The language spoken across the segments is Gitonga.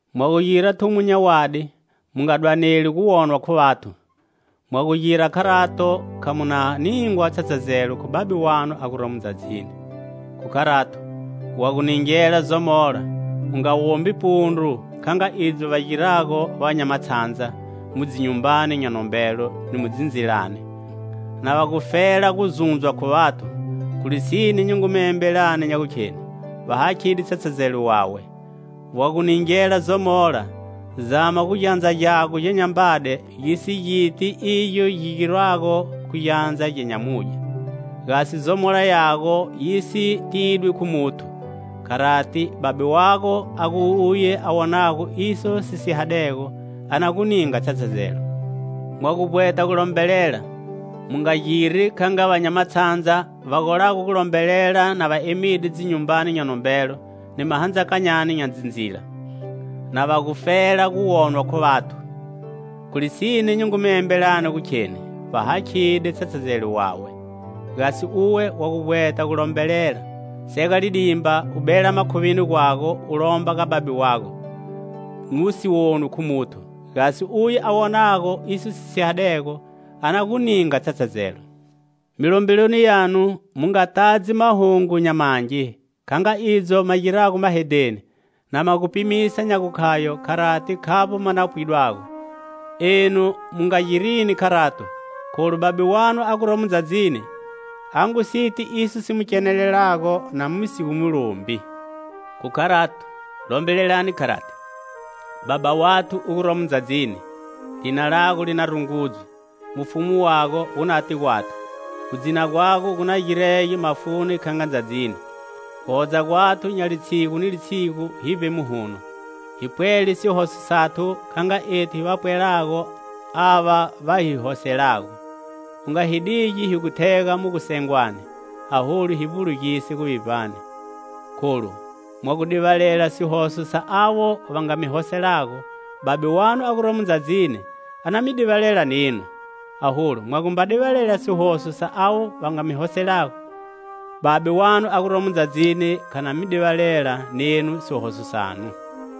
"Mwa gu gira thumo nya wadi mu nga dwaneli gu wonwa khu vathu. Mwa gu gira kharato kha mu na ningwa tshatshazelo khu Babe wanu a guromo ndzadzini. Khu kharato, wa gu ningela zomola, u nga wombi pundru, kha nga idzo va girago va nya matshandza mu dzinyumbani nya nombelo ni mu dzindzilani, na va gufela guzundzwa khu vathu. Khu lisine, nyi ngu mi embelani nya gukheni, va hakhide tshatshazelo wawe. Wa gu ningela zomola, zama gu gyandza gyago gya nyambade gisi giti igyo gi girwago khu gyandza gya nyamudye, gasi zomola yago yi si tidwi khu muthu. Kharati, Babe wago, a gu uye a wonago iso si sihadego, a na gu ninga tshatshazelo. "Mwa gu vbweta gulombelela, mu nga giri kha nga va nya matshandza, va golago gulombelela na va emide dzinyumbani nya nombelo ni mahandzakanyani nya dzindzila, na va gufela gu wonwa khu vathu. Khu lisine nyi ngu mi embelani nya gukheni va hakhide tshatshazelo wawe. Gasi uwe wa gu vbweta gu lombelela, sega lidimba, u bela makhuvini gwago u lomba ga Babe wago, nu si wonwi khu muthu, gasi uye a wonago iso si sihadego, a na gu ninga tshatshazelo. "Milombeloni yanu mu nga tadzi mahungo nya mangi, kha nga idzo ma girago mahedheni, na ma gu pimisa nya gukhayo kharati khavbo ma no pwidwago. Enu mu nga girini kharato, kholu Babe wanu a guromo ndzadzini a ngu si ti iso si mi kenelelago na mu si gu mu lombi. "Khu kharato, lombelelani kharati:'Baba wathu u guromo ndzadzini,lina lago li na rungudzwe. Mufumu wago wu nate gwathu;Gudzina gwago gu na girege mafuni kha nga ndzadzini. Guhodza gwathu nya litshigu ni litshigu hivbe muhuno. Hi pwele sihoso sathu,kha nga ethu hiva pwelago ava va hi hoselago. U nga hi digi hi gu thega mu gusengwani,aholu hi vbulugise guvivbani "Kholu mwa gu divalela sihoso sa avo va nga mi hoselago, Babe wanu a guromo ndzadzini a na mi divalela nenu. Aholu mwamba divalela sihoso sa avo va mi hoselago, Babe wanu a guromo ndzadzini kha na mi divalela nenu sihoso sanu.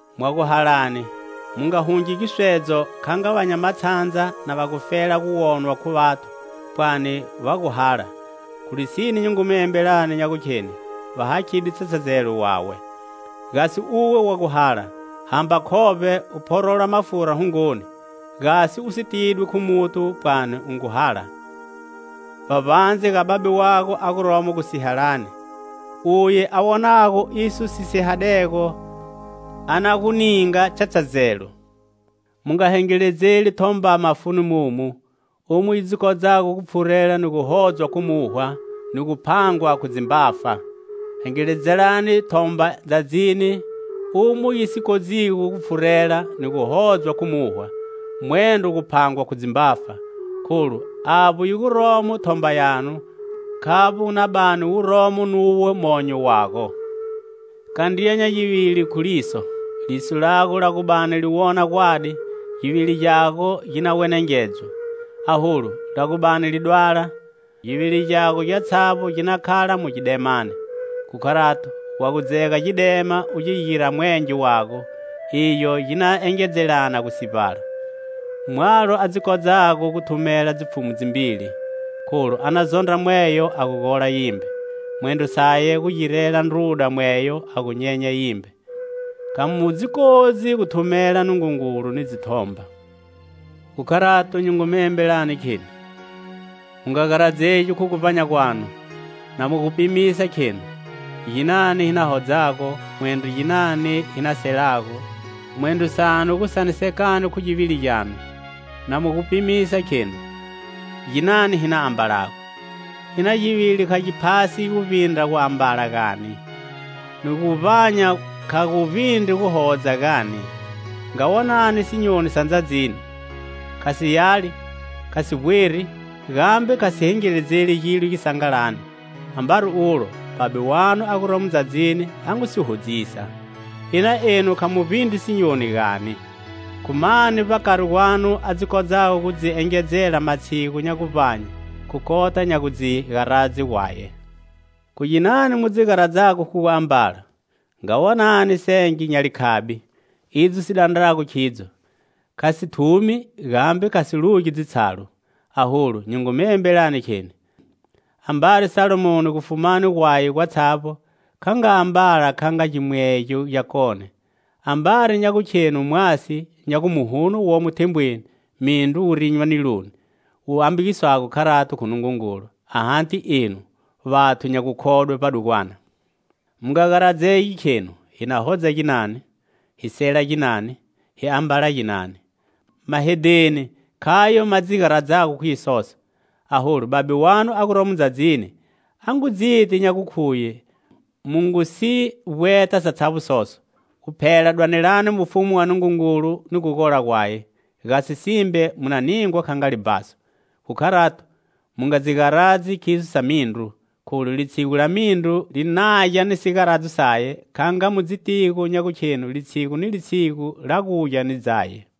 "Mwa gu halani, mu nga hungi giswedzo, kha nga va nya matshandza, na va gufela gu wonwa khu vathu pwani va ngu hala. Khu lisine nyi ngu mi embelani nya gukheni va hakhide tshatshazelo wawe. Gasi uwe wa gu hala, hamba khovbe, u phorola mafura hungoni, gasi u si tidwi khu muthu pwani u ngu hala, vbavbandze ga Babe wago a guromo gusihalani. Uye a wonago iso si sihadego, a na gu ninga tshatshazelo. "Mu nga hengeledzeli thomba mafuni mumu, umo yi dzi kodzago gu pfhurela, ni gu hodzwa khu muwha ni gu phangwa khu dzimbafa. Hengeledzelani thomba ndzadzini, umo yi si dzi kodzigo gu pfhurela, ni gu hodzwa khu muwha, mwendro gu phangwa khu dzimbafa. Kholu avbo yi guromo thomba yago, khavbo wu na bani romo nu monyo wago. "Kandriya nya givili khu liso. Liso lago la gu bani li wona gwadi, givili gyatshavbo gi na wenengedzwa. Aholu la gu bani li dwala, givili gyago gyatshavbo gi na khala mu gidemani. Khu kharato, wa gu dzega gidema u gi gira mwenge wago, igyo gi na engedzelana gu sivbala! "Mwalo a dzi kodzago gu thumela dzipfhumu dzimbili. Kholu a na zondra mweyo a gu gola yimbe; mwendro saye gu girela ndruda mweyo a gu nyenya yimbe. Kha mu dzi kodzi gu thumela Nungungulu ni dzithomba. "Khu kharato nyi ngu mi embelani, kheni: mu nga garadzegi khu guvbanya gwanu, na mu gu pimisa, khenu: Ginani hi na hodzago, mwendro ginani hi na selago mwendro sanu gu sanisekani khu givili gyanu, na mu gu pimisa, khenu: Ginani hi na ambalago. Ina givili kha gi phasi guvbindra guambala, gani? Ni guvbanya kha gu vbindri guhodza, gani? Nga wonani sinyoni sa ndzadzini. Kha si yali, kha si vbweri, gambe kha si hengeledzeli gilo sisangalani. Ambari ulo, Babe wanu a guromo ndzadzini a ngu si hodzisa. Ina enu kha mu vbindri sinyoni, gani? Khu mani, vbakari gwanu, a dzi kodzago gu dzi engedzela matshigu nya guvbanye, khu kota nya gu dzi garadze gwaye? "Khu ginani mu dzi garadzago khu guambala? Nga wonani senge nya likhabi, idzo si dandrago khidzo! Kha si thumi gambe kha si lugi dzitshalu. Aholu nyi ngu mi embelani, kheni: Ambari Salomoni, gufumani gwaye gwatshavbo, kha ambala kha nga gimwegyo gyakone. Ambari nya gukhenu mwasi, nya gu muhuno womo thembweni, mindru wu rinywa niloni, wu ambagiswago kharati khu Nungungulu, ahati enu, vathu nya gukhodwe vbadugwana? Mu nga garadzegi, khenu, hi na hodza ginani? Hi na sela ginani? 'Hi na ambala ginani?' Mahedheni khayo ma dzi garadzago khu isoso. Aholu Babe wanu a guromo ndzadzini a ngu dziti nya gukhuye mu ngu si vbweta satshavbo soso. Guphela dwanelani mufumu wa Nungungulu ni gugola gwaye; gasi simbe mu na ningwa kha nga libhaso. Khu kharato, mu nga dzi garadzi khiso sa mindru, kholu litshigu la mindru li nagya ni sigaradzo saye, kha nga mu dzitigo nya gukhenu litshigu ni litshigu la gugya ni dzaye.